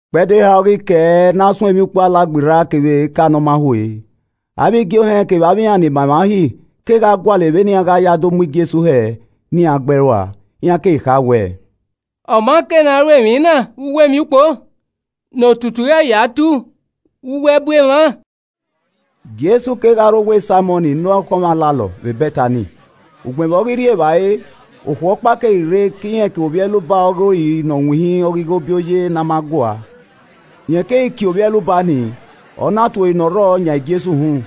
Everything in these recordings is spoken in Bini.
Ikpẹdẹ eha ọre ọ ghi kẹe ne a suẹn Emwiukpo Alagberra kevbe Eka Ne ọ ma hue. Avbe igie ohẹn kevbe avbe iran ni ma emwa Uhi kegha gualọ vbene iran gha ya do mu Jesu hẹ ne iran gbe ẹe rua. Iran keghi kha wẹ, “Ọ ma kei ne a ru emwi na vbe uwu emwiukpo, ne otutu ghẹ ya tu vbe uwu ẹbu emwa.” Jesu kegha rre owa Saimọn ne ọkhọnmwọ alalọ vbe Bẹtani, ugbẹn vbe ọ ghi rri evbare, okhuo ọkpa keghi rre ke irẹn kevbe ovbi ẹluba ọghe ori ne ọ winhin ọghe ighobioye ne a ma gua. Rẹn keghi kie ovbi ẹluba ni, ọ na tue ori ne ọ rrọọ yan Jesu uhunmwu.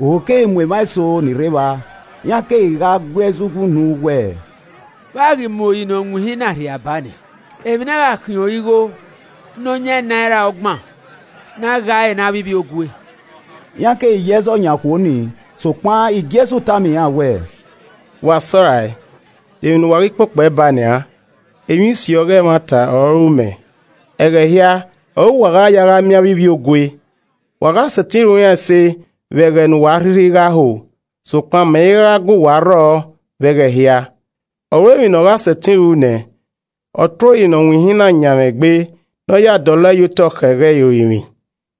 Ohu keghi mu emwa eso ni rre evba, iran kegha gui ẹzọ uwunu wẹ, “Vbe a ghi mu ori ne ọ winhin na rhia a ha nian? Emwi ne a gha khiẹn ọre igho ne ọ yan naira ọgban ne a gha ẹre ne avbe ivbiogue.” Iran keghi ye ẹzọ yan okhuo ni. Sokpan Jesu tama iran wẹẹ, “Wa sẹ ọe rae! De emwi ne uwa ghi kpokpo ẹe ba nian? Emwi usi ọghe ẹmwata ọre ọ ru mẹ. Ẹghẹ hia ọre uwa gha ya gha miẹn avbe ivbiogue, wa gha sẹtin ru iran ẹse vbe ẹghẹ ne uwa a rhirhi gha ho, sokpan mẹ i ra gha gue uwa rrọọ vbe ẹghẹ hia. Ọ ru emwi ne ọ gha sẹtin ru nẹ, ọ tue ori ne ọ winhin na yan mwẹ egbe ne ọ ya dọlọ ẹe ye otọ khẹ ẹghẹ irorinmwi.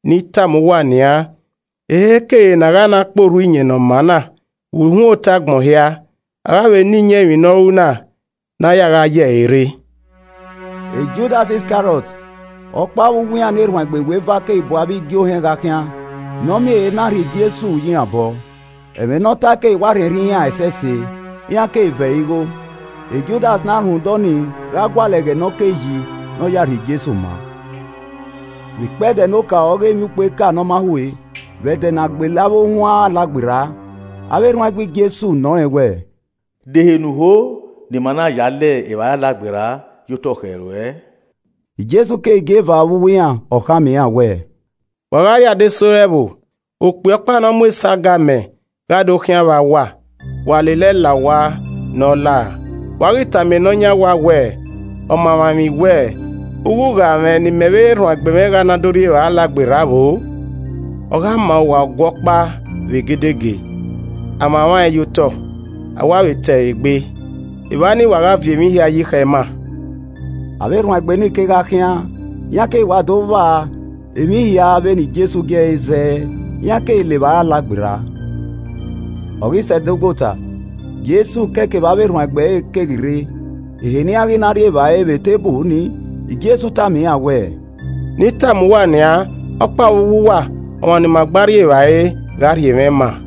Ne I tama uwa nian, eheikehe ne a gha na kpe orhu iyẹn ne ọ maa na vbe uhunmwu otọ agbọn hia, a gha vbe na iyẹn emwi ne ọ ru na ne a ya gha ye ẹre rre.” Judas Iskariọt, ọkpa vbe uwu iran ne erhuanegbe iweva keghi bu avbe igie ohẹn gha khian ne ọ miẹn ehe na rhie Jesu ye iran obọ. Ẹmwẹ ne ọ tae keghi wa rhiẹnrhiẹn iran ẹsẹse, iran keghi ve ẹre igho. Judas na rhunmwuda ọnii gha gualọ ẹghẹ ne ọ kei yi ne ọ ya rhie Jesu maa. Vbe ikpẹdẹ ne okaro ọghe Emwiukpo Eka Ne ọ ma hue, vbe ẹdẹ ne a gbele avbe ohuan Alagberra, avbe erhuanegbe Jesu nọ rẹn wẹẹ, “De ehe ne u ho ne ima na ya le evbare Alagberra ye otọ khẹ ruẹ?” Jesu keghi gie eva vbe uwu iran, ọ khama iran wẹẹ, “Wa gha rrie adesẹ ore ẹvbo, okpia ọkpa ne ọ mu esago amẹ gha do khian vba uwa. Wa lele ẹe la owa ne ọ lao, wa ghi tama ne ọ yan owa wẹẹ, ‘Ọmamwaemwi wẹ, Ughugha mwẹ ne imẹ vbe erhuanegbe mwẹ gha na do gba rri evbare Alagberra vbo?’ Ọ gha ma uwa Ọgua ọkpa vbe egedege, a mwamwa ẹn ye otọ, a wa vbe te ẹre egbe, evba nii wa gha viọ emwi hia yi khẹ ima.” Avbe erhuanegbe nii kegha khian, iran keghi wa do vba emwi hia vbe ne Jesu gie ẹre zẹẹ iran keghi le evbare Alagberra. Ọ ghi sẹ ẹdogbo ota, Jesu kẹe kevbe avbe erhuanegbe ẹre keghi rre. Ehe ne iran ghi na rri evbare vbe eteburu ni, Jesu tama iran wẹẹ, “Ne I tama uwa nian, ọkpa vbe uwu uwa, ọmwa ne ima gba rri evbare, gha rhie mwẹ ma an.”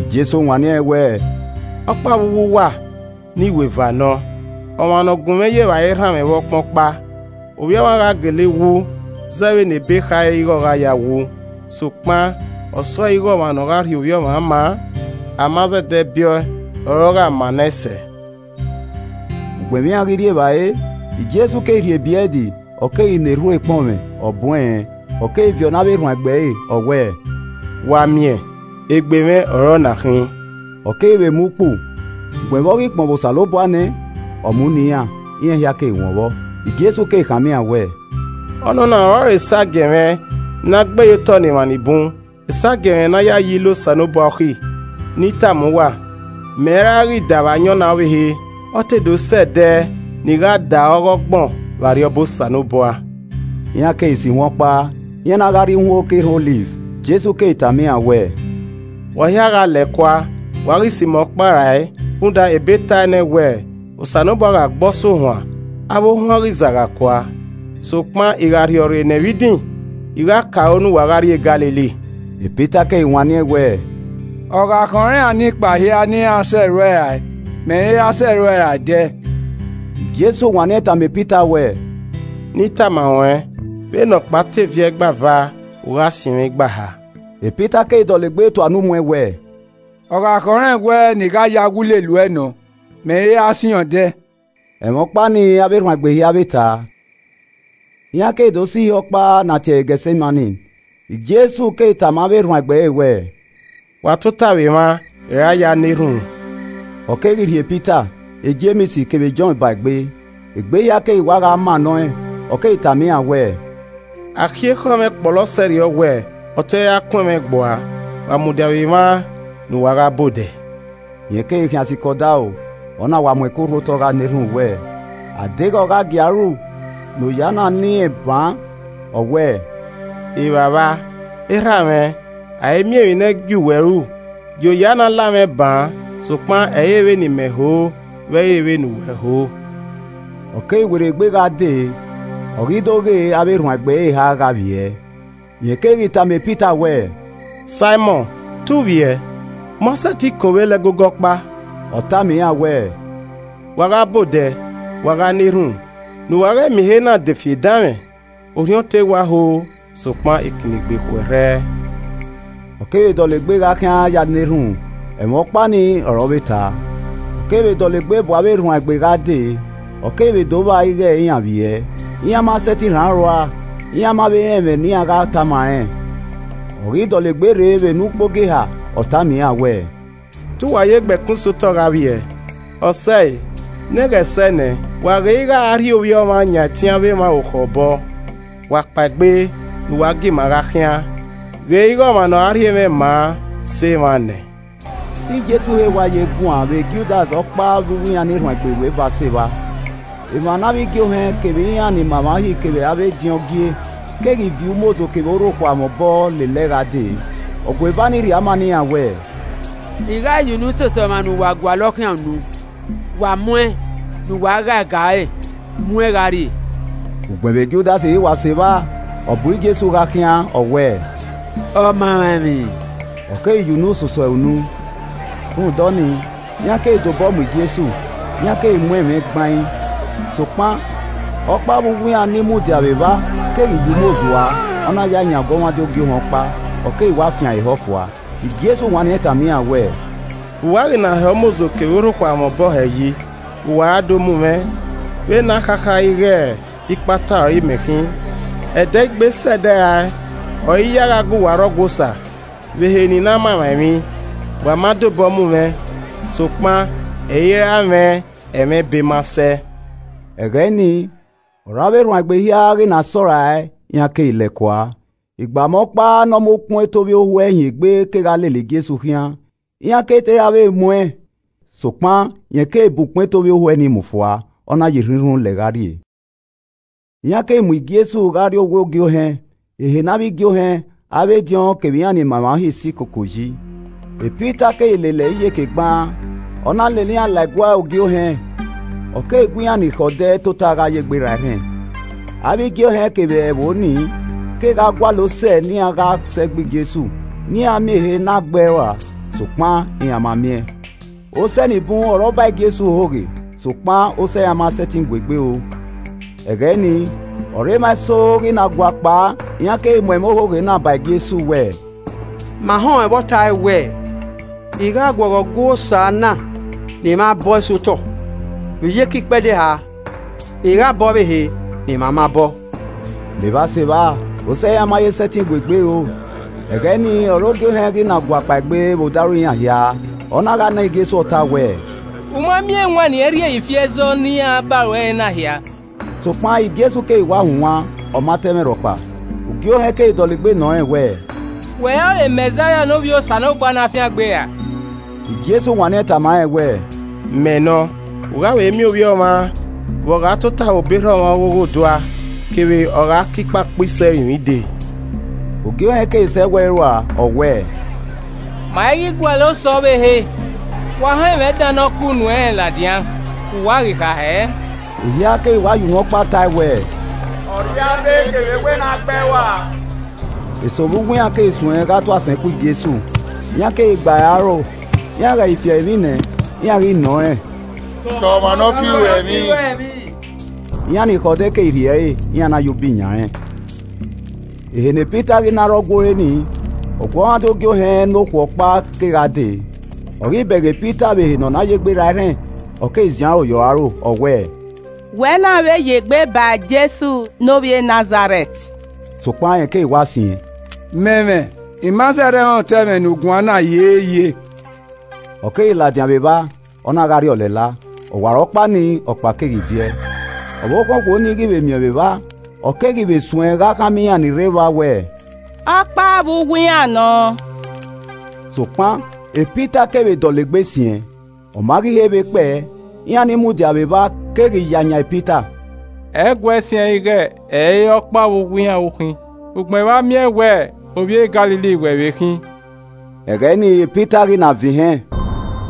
Jesu wanniẹn wẹẹ, “Ọkpa vbe uwu uwa ne iweva nọ, ọmwa ne ọ gunmwẹ ya evbare rhanmwẹ vbe ọkpan ọkpa. Ovbi Ọmwa gha gele wu zẹ vbene Ebe khare ighe ọ gha ya wu, sokpan, ọsọre ighe ọmwa ne ọ gha rhie Ovbi Ọmwa ma an! A ma zẹdẹ biẹ ọe ọre ọ gha maa nẹ ẹn sẹẹ!” Ugbẹn vbe iran ghi rri evbare, Jesu keghi rhie ebrẹd ọ keghi na erhunmwu ekpọnmwẹ, ọ bun ẹnrẹn ọ keghi viọ ne avbe erhuanegbe ẹre ọ wẹẹ, “Wa miẹn, egbe mwẹ ọ re ọna khin.” Ọ keghi vbe mu ukpu, ugbẹn vbe ọ ghi kpọnmwẹ Osanobua nẹ, ọ mu ne iran, iran hia keghi wọn vbọ. Jesu keghi khama iran wẹẹ, “Ọnọna ọrọre esagiẹn mwẹ ne a gbe ye otọ ne emwa ni bun, esagiẹn mwẹ ne a ya yi ile Osanobua okhi. Ne I tama uwa, mẹ i ra ghi da vbe ayọn na ọvbehe, ọ te do sẹ ẹdẹ ne I gha da ọghọgbọn vbe Arriọba Osanobua.” Iran keghi so ihuan ọkpa, iran na gha rrie uhunmwu oke erhan Ọliv. Jesu keghi tama iran wẹẹ, “Wa hia gha lẹ kua, wa ghi sẹ imẹ ọkpa rae rhunmwuda ebe tae nẹ wẹẹ, ‘Osanobua gha gbe ọsuohuan, avbe ohuan ghi zagha kua.’ Sokpan I gha rhiọrre nẹ vbe idin, I gha ke aro ne uwa gha rrie Galili.” Pita keghi wanniẹn wẹẹ, “Ọ gha khọn iran nekpa hia ne iran sẹ ruẹ rae, mẹ i ra sẹ uẹ rae ẹdẹ.” Jesu wanniẹn tama Pita wẹẹ, “Ne I tama ruẹn, vbene ọkpa te viẹ igba eva, u gha siẹn mwẹ igba eha.” Pita keghi dọlegbe tua unu mu ẹn wẹẹ, “Ọ gha khọnrẹn wẹ ne I gha na wu lele uẹ nọ, mẹ i ra siẹn uẹn ẹdẹ.” Ẹmwẹ ọkpa ni avbe erhuanegbe hia vbe ta. Iran keghi do sẹ ihe ọkpa ne a tie ẹre Getsemani. Jesu keghi tama avbe erhuanegbe ẹre wẹẹ, “Wa tota vbe emwa, I ra ya na erhunmwu.” Ọ keghi rhie Pita, Jems kevbe Jọn ba egbe. Egbe hia keghi wa gha mannọ ẹn. Ọ keghi tama iran wẹẹ, “Akhiẹ ekhọe mwẹ kpọlọ sẹrriọ wẹ, ọ te ra kuẹn mwẹ gbua. Wa mudia vbe emwa ne uwa gha ba odẹ.” Rẹn keghi khian sikẹ odaro, ọ na wa mu ẹko rhu otọ gha na erhunmwu wẹ, A deghẹ ọ gha gie a ru ne oya nii la irẹn baan. Ọ wẹẹ, “Evbavba, Erha mwẹ, a i miẹn emwi ne ẹ i gie uwẹ ru, gie oya na la mwẹ baan sokpan, ẹ i re vbene Imẹ ho vbe ẹ i re vbene uwẹ ho.” Ọ keghi werriegbe gha dee ọ ghi do ghee avbe erhuanegbe ẹre eha gha vbiẹ. Rẹn keghi tama Pita wẹẹ, “Saimọn, te u vbiẹ? U ma sẹtin kọn ovbe la ẹgogo ọkpa!” Ọ tama iran wẹẹ, “Wa gha ba odẹ, wa gha na erhunmwu, ne uwa ghẹ miẹn ehe na de fi edanmwẹ. Orhiọn te wa ho sokpan ikinnegbe khuẹrhẹ.” Ọ kevbe dọlegbe gha khian ya na erhunmwu, ẹmwẹ ọkpa nii ọre ọ vbe ta. Ọ keghi vbe dọlegbe bu avbe erhuanegbe gha dee, ọ keghi vbe do vba ighe iran vbiẹ, iran ma sẹtin rhan aro rua. Iran ma vbe rẹn ẹmwẹ ne iran gha tama rẹn. Ọ ghi dọlegbe rre vbe ne ukpogieha, ọ tama iran wẹẹ, “Te uwa ye gbe ẹkun sẹ otọ gha vbiẹ? Ọ sẹe! Ne ẹghẹ sẹ nẹ! Wa ghe ighe a rhie Ovbi Ọmwa yan ẹtin avbe emwa orukhọ obọ. Wa kpaegbe ne uwa gie ima gha khian. Ghe ighe ọmwa ne ọ rhie mwẹ ma an sẹ emwa nẹ!” Te Jesu he wa ye guan vbe Judas, ọkpa vbe uwu iran ne iweva sẹ evba. Emwa ne avbe igie ohẹn, kevbe iran ni ma emwa Uhi kevbe avbe ediọn gie, keghi viọ umozo kevbe orhokhua mwẹ obọ lele ẹe gha dee. Ọgueva nii rhie ama ne iran wẹẹ, “I gha ya unu soso ọmwa ne uwa gualọ khian unu, wa mu ẹn, ne uwa ghae ga ẹre mu ẹn gha rrie.” Ugbẹn vbe Judas ghi wa sẹ evba, ọ bu Jesu gha khian ọ wẹẹ, “Ọmamwaemwi,” ọ keghi ya unu soso ẹre unu. Rhunmwuda ọnii, iran keghi de obọ mu Jesu, iran keghi mu ẹn mwẹ gbain. Sokpan ọkpa vbe uwu iran ni mudia vbe evba keghi yuo umozo ua, ọ na yae yan ọguọmwadia ogie ohẹn ọkpa, ọ keghi wa fian ẹre ehọ fua. Jesu wanniẹn tama iran wẹẹ, “Vbe uwa ghi na hẹ umozo kevbe orhokhua mwẹ obọ hẹ yi vbe uwa ra do mu mwẹ, vbe ne a khakha ighe ikpata ọre Imẹ khin. Ẹdẹ i gbe sẹ ẹdẹ rae ọre I ya gha gu uwa rre Ọgua Osa vbe ehe ne I na ma emwa emwi, wa ma de obọ mu mwẹ. Sokpan, ẹ i ra mwẹ ẹmwẹ Ebe ma sẹ.” Ẹghẹ ni ọre avbe erhuanegbe hia ghi na sẹ ọe rae, iran keghi lẹẹ kua. Igbama ọkpa ne ọ mu ukpọn eto ovbiohuẹ hin egbe kegha lele Jesu khian. Iran keghi te ra vbe mu ẹn. Sokpan rẹn keghi ban ukpọn eto ovbiohuẹ ni mu fua, ọ na ya irhunmwirhun lẹ gha rrie. Iran keghi mu Jesu gha rrie owa Ogie Ohẹn, ehe ne avbe igie ohẹn, avbe ediọn kevbe iran ni ma emwa Uhi si koko yi. Pita keghi lele iran iyeke gbaan, ọ na lele iran la ẹguae Ogie Ohẹn. Ọ keghi gu iran ni khẹ odẹ tota gha ye egbe ra erhẹn. Avbe igie ohẹn kevbe ẹvbo nii, kegha gualọ osẹe ne iran gha sẹ gbe Jesu ne iran miẹn ehe na gbe ẹe rua, sokpan iran ma miẹn. Osẹe ni bun ọre ọ ba Jesu ohoghe, sokpan, osẹe iran ma sẹtin gu egbe ro. Ẹghẹ nii ọre emwa eso ghi na guakpao, iran keghi mu ẹmwẹ ohoghe na ba Jesu wẹẹ, “Ma họn ẹn vbe ọ tae wẹ, ‘I gha guọghọ Ọgua Osa na ne emwa bọe sẹ otọ, vbe iyeke ikpẹdẹ eha, I gha bọ ọvbehe ne emwa ma bọ’” Levba sevba, osẹe iran ma ye sẹtin gu egbe ro. Ẹghẹ nii ọre Ogie Ohẹn ghi na gua kpaegbe vbe odaro iran hia, ọ na gha nọ Jesu ọta wẹẹ, “U ma miẹn ewanniẹn rhie ye ifi ẹzọ ne iran ba ruẹ re na hia.” Sokpan Jesu keghi wa hunwan, ọ ma ta ẹmwẹ rhọkpa. Ogie Ohẹn keghi dọlegbe nọ rẹn wẹẹ, “Wẹ ọrọre Mẹzaia ne Ovbi Osanobua Ne a fiangbe ra?” Jesu wanniẹn tama rẹn wẹẹ, “Mẹ nọ, u gha vbe miẹn Ovbi Ọmwa vbe ọ gha tota vbe obọ erha ọmwa ọghe Oghodua kevbe ọ gha ke ikpakpa iso ẹrinmwi dee.” Ogie Ohẹn keghi sọ ẹwu ẹre ua, ọ wẹẹ, “Ma i ghi gualọ osẹe ọvbehe. Wa họn ẹmwẹ dan ne ọ ke unu ẹnrẹn ladian, vbe uwa ghi kha hẹẹ?” Ehia keghi wa ye unu ọkpa tae wẹ: “Ọ rria abe kevbe wẹ, ne a gbe ẹe rua.” Eso vbe uwu iran keghi suẹn gha tu asẹn ku Jesu, iran keghi gba ẹre aro, iran ghẹ ghi fi ẹre emwi nẹ, iran ghi nọ rẹn, “Ta ọmwa nọ fi uẹ emwi!” Iran ni khẹ odẹ keghi rhie ẹre, iran na ya ubi yan rẹn. Ehe ne Pita na rre Ọgua ore ni, ọguọmwadia Ogie Ohẹn ne okhuo ọkpa kegha dee. Ọ ghi bẹghe Pita vbe ehe ne ọ na ye egbe ra erhẹn, ọ keghi ziẹn aro ye ọre aro, ọ wẹẹ, “Wẹ na vbe ye egbe ba Jesu ne ovbi e Nazarẹt.” Sokpan rẹn keghi wa siẹn, “Mẹ mwẹ, I ma zẹdẹ rẹn otọ ẹmwẹ ne u guan na hiehie.” Ọ keghi ladian vbe evba, ọ na gha rrie ọlẹla. Ọwarọkpa ni, ọkpa keghi viẹ. Ọvbokhan okhuo nii ghi vbe miẹn ọẹn vbe evba, ọ keghi vbe suẹn gha khama iran ni rre evba wẹẹ, “Ọkpa vbe uwu iran nọ.” Sokpan Pita keghi vbe dọlegbe siẹn. Ọ ma ghi re vbe kpẹe, iran ni mudia vbe evba keghi ya yan Pita, “Ẹ i guẹ siẹn ighẹ ẹ i re ọkpa vbe uwu iran u khin, ugbẹn vbe a miẹn wẹ Ovbi e Galili wẹ vbe khin.” Ẹghẹ nii Pita ghi na vẹn ihẹn,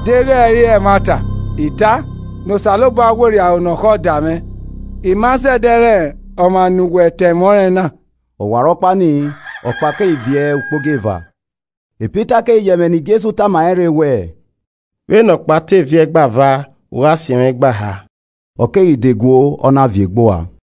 “Deghẹ ẹ i re ẹmwata I ta ne Osanobua werriẹ aro ne ọ khọ da mwẹ. I ma zẹdẹ rẹn ọmwa ne uwa ta ẹmwẹ ọnrẹn na.” Ọwarọkpa nii, ọkpa keghi viẹ ukpogieva. Pita keghi ye ẹmwẹ ne Jesu tama rẹn rre wẹẹ, “Vbene ọkpa te viẹ igba eva, u gha siẹn mwẹ igba eha.” Ọ keghi de guo, ọ na viẹ egbe ua.